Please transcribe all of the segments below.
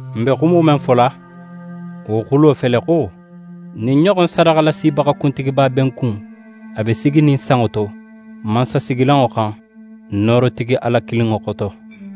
N be xumo men fola, wo xulo fele xo, ɲin ɲoxon sadaxalasibaxa kuntigiba be n kun, a be siginin sanŋo to, mansasigilanŋo xan, noorotigi Ala kininŋo xoto.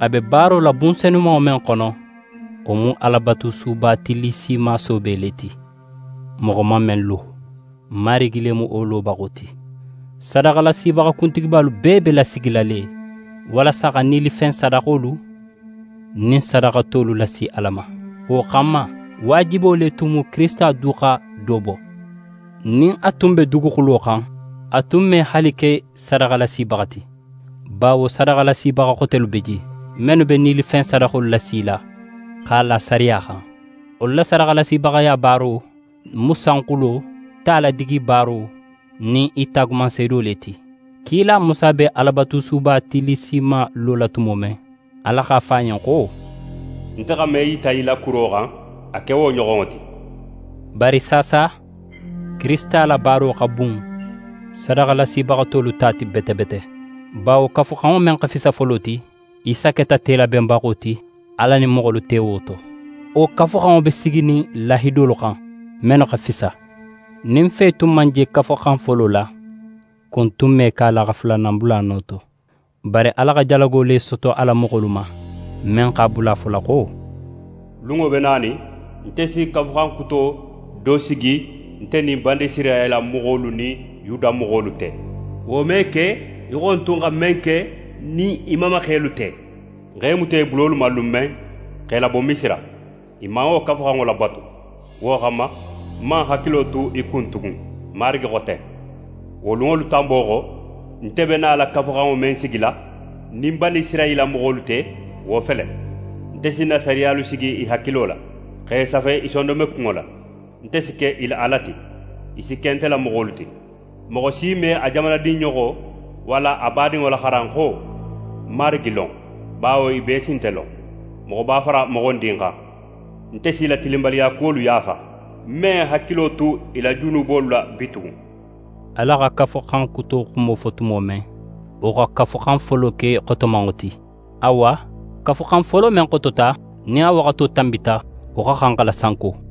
A be baaro la bun senumanŋo men xono, wo mu Alabatusuba tillisima soobe le ti, moxo man men lo. Marigi le mu wo lobaxo ti. Sadaxalasibaxa kuntigibalu bee be lasigila le walasa xa nilifen sadaxolu nin sadaxa tolu lasi Ala ma. Wo xanma, waajibo le tun mu Kirisita du xa do bo. Nin a tun be duguxulo xan, a tun me haali ke sadaxalasibaxa ti, bawo sadaxalasibaxa xotelu be je, mennu be nilifen sadaxolu lasila x'a la sariya xan. Wolu la sadaxalasibaxaya baaro mu sanxulo ta ladigibaaro nin i taagumanseedo le ti. Kila Musa be Alabatusuba tillisima lola tumo men, Ala x'a fo a ɲen xo: «Nte xa men yita í la kuro xan, a ke wo ɲoxonŋo ti.» Bari saasa, Kirisita la baaro xa bun sadaxalasibaxa tolu ta ti bete bete; bawo Kafuxanŋo men xa fisa folo ti, Isa keta telabenbaxo ti Ala nin moxolu te wo to. Wo Kafuxanŋo be siginin lahidolu xan, mennu xa fisa. Nin fe tun man je Kafuxan folo la, kun tun me ke a la xa fulanan bula a no to. Bari Ala xa jalago le soto a la moxolu ma, men x'a bula a fola xo: «Lunŋo be nanin, nte si kafuxan kuto do sigi nte nin Banisirayila moxolu nin Yuda moxolu te. Wo me ke í xo ń tun xa men ke ń nin i mamaxelu te, ń x'e muta i bulolu ma lun men, x'e labo Misira. I man wo kafuxanŋo labatu. Wo xanma, ń man ń hakilo tu i kun tugun. Marigi xo ten. Wo lunŋolu tanbo xo, nte be nala kafuxanŋo men sigila ń nin Banisirayila moxolu te, wo fele: Nte si ń na sariyalu sigi i hakilo la, x'e safe i sondonmekunŋo la. Nte si ke i la Ala ti, i si ke nte la moxolu ti. Moxo si me a jamanadinɲoxo walla a badinŋo laxaran xo: “Marigi lon”. Bawo i bee si nte lon, moxoba fara moxondin xan. Nte s'i la tilinbaliyakuwolu yaafa, ń me ń hakilo tu i la junubolu la bitugun.» Ala xa Kafuxan Kuto xumo fo tumo men, wo xa Kafuxan folo ke xotomanŋo ti. Awa, Kafuxan folo men xotota, nin a waxato tanbita, wo xa xan xa lasanko.